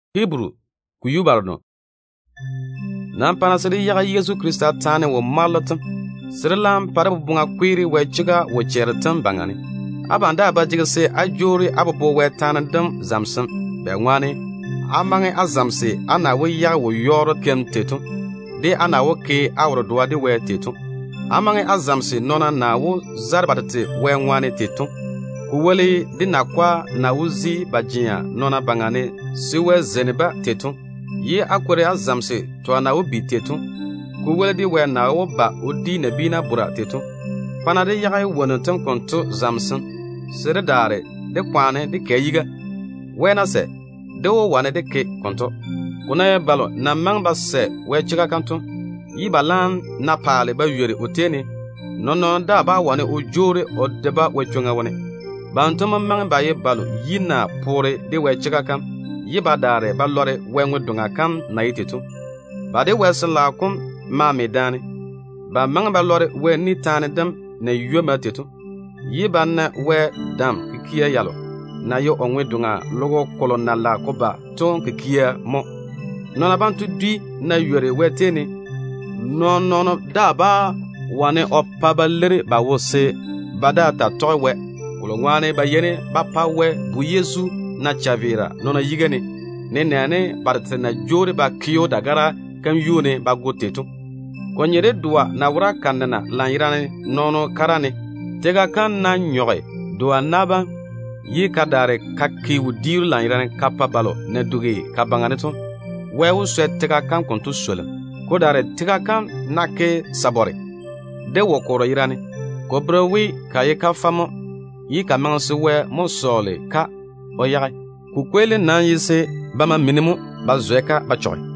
Konto ŋwaane pa-na se dé yage Yezu Krista taane wo-mwaalo tem, se dé laam pa dé boboŋa kweere Wɛ chega kam seeni. Abam daa ba jege se á jwoori á bobo Wɛ taane dem zamesem, bɛŋwaane á maŋe á lɔre á na wó yage wo-yɔɔro kikia wo-yɔɔro kikia naa kikia yalo na pae toone to tei to, de á na wó ke á wo-dedoa de Wɛ tei to. Á maŋe á zamese nɔɔna na wó zare ba tete Wɛ ŋwaane tei to, ko woli de nakwa na wó kwei ba je ba daŋe nɔɔna yuu ne se Wɛ zeini-ba tei to, ye á kwori á zamese twa na wó bi tei to, ko woli de Wɛ na wó ba o di nabiina bora tei to. Pa-na dé yage wonnu tem konto zamesem se dé daare dé kwaane dé kɛ yiga. Wɛ ná sɛ, dé wó wane dé ke konto. Ko ná ye balo na maŋe ba sɛ Wɛ chega kam to, ba laam ná paale ba ywori o tei ne, nɔɔn-nɔɔno daa bá wane o jwoori o de-ba Wɛ chwoŋa wone. Banto mo maŋe ba ye balo yi na poore de Wɛ chega kam ye ba daare ba lɔre Wɛ ŋwe-doŋa kam na ye tei to. Ba de Wɛ Sin-laao kom maa me daane. Ba maŋe ba lɔre Wɛ ni taane dem na ywomma tei to, ye ba na Wɛ totoŋ-kamunnu telo na maŋe de Wɛ paare delo na lage de ba to mo. Nɔɔna banto dwi ná ywori Wɛ chwoŋa wone, nɔɔn-nɔɔno daa bá wane o pa ba leiri ba wo se ba daa taa tɔge Wɛ, kolo ŋwaane ba yeini ba pa Wɛ Bu Yezu na chaveera nɔɔna yiga ne, nenɛɛne ba tete na jwoori ba ke‑o dagara kam yuu ne ba go tei to. Ko nye de doa ná wora ka nena lanyerane nɔɔno kara ne. Tega kam ná nyɔge doa na bam, ye ka daare ka ke wodiiru lanyerane ka pa balo na dugi ka baŋa ne to, Wɛ wó swɛ tega kam konto swolim. Ko daare tega kam ná ke sabare de wo-korro yerane, ko bere we ka ye kafɛ mo ye ka maŋe se Wɛ mo sɔɔle-ka o yage. Ko kweelim nam ye se ba ma mini mo ba zwɛ-ka ba chɔge.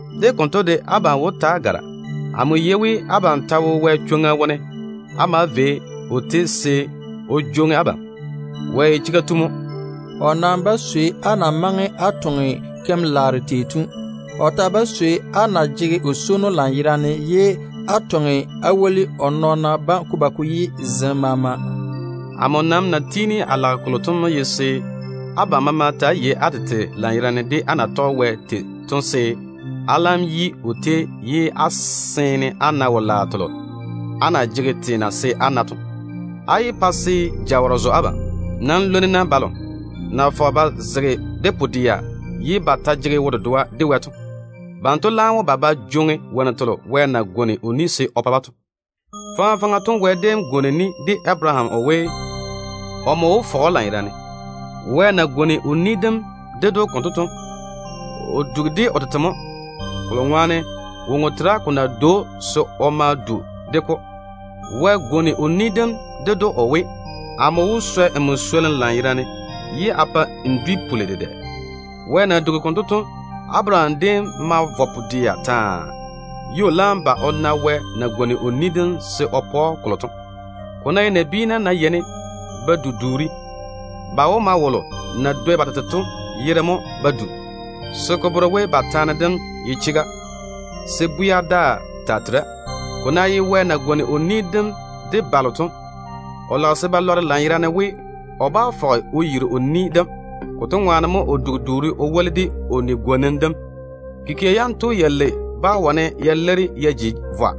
De konto de, a badwoŋ-swonnu bam, abam wó taa gara. Amo yei we abam ta wo Wɛ chwoŋa wone á maa vei o tei se o jwoŋi abam. Wɛ ye chega tu mo. O nam bá swei á na maŋe á tɔge keim-laaro tei to. O ta bá swei á na jege o swono lanyerane, ye á toŋe á woli o nɔɔna bam ko ba ko yi zem maama to. Amo nam na tiini a lage kolo to mo ye se abam maama ta‑á yei á tete lanyerane de á na tɔge Wɛ tei to, se á laam vo á yi o tei ye á seene á na wo-laaro telo á na jege teena se á na to. Á yé pa se jawɔrɔ zo abam. Nam lwoni-na balo na fɔge ba zege de pu-dɛa ye ba jege wo-dedoa de Wɛ to. Banto laam wó ba ba jwoŋi wonnu telo Wɛ na pwooli we, o wó pa-ba to. Faŋa faŋa to, Wɛ déem pwooli de Abaraham o we, omo wó fɔge‑o lanyerane. Wɛ na tiŋi o ni dem ded‑o konto to, o dugi de o tete mo, kolo ŋwaane woŋo tera ko na dwoi‑o se o ma du de-ko. Wɛ gwoni o ni dem ded‑o o we: “Amo wó swɛ nmo swolim lanyerane ye a pa se n dwi dem puli dedɛ.” Wɛ na dugi konto to, Abaraham déem ma vɔ pu-dɛa taa, ye o laam ba o na Wɛ na pwooli se o pa‑o kolo to. Ko ná ye nabiina ná yeini ba du duuri, ba wó ma wolo na dwoi ba tete to yere mo ba du, se ko bere we ba taane dem ye chega, se bwɛa daa ta tera. Ko ná ye Wɛ na pwooli kampwola de balo to, o lage se ba lɔre lanyerane we, o bá fɔge o yiri o ni dem. Konto ŋwaane mo o dugi duuri o woli de o kampwola kam. Kikia yanto yalei bá wane ya leiri ya ji vwa,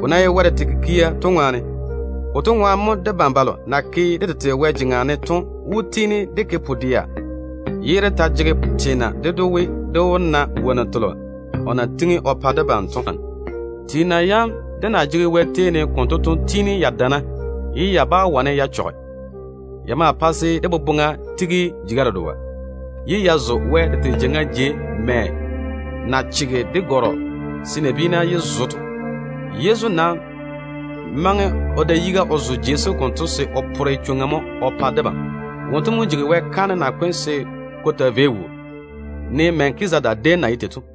ko na ye Wɛ tete kikia to ŋwaane. Konto ŋwaane mo debam balo na ke dé tete Wɛ jeŋa ne to wó tiini dé ke pu-dɛa ye dé ta jege teena ded‑o we, dé wó na wonnu telo o na tiŋi o pa debam to. Teena yam dé na jege Wɛ tei ne konto to tiini ya dana ye ya bá wane ya chɔge. Ya maa pae se dé boboŋa tigi jeiga dedoa, ye ya zo Wɛ tete jeiŋa jei mɛ na chege de gare-jale se nabiina yé zo to. Yezu nam maŋe o da yiga o zo jei sem konto se o pore chwoŋa mo o pa debam. Wonto mo jigi Wɛ kaanem nakwe tu se ko taa vei wuu, ne Melkizedeka déem na ye tei to.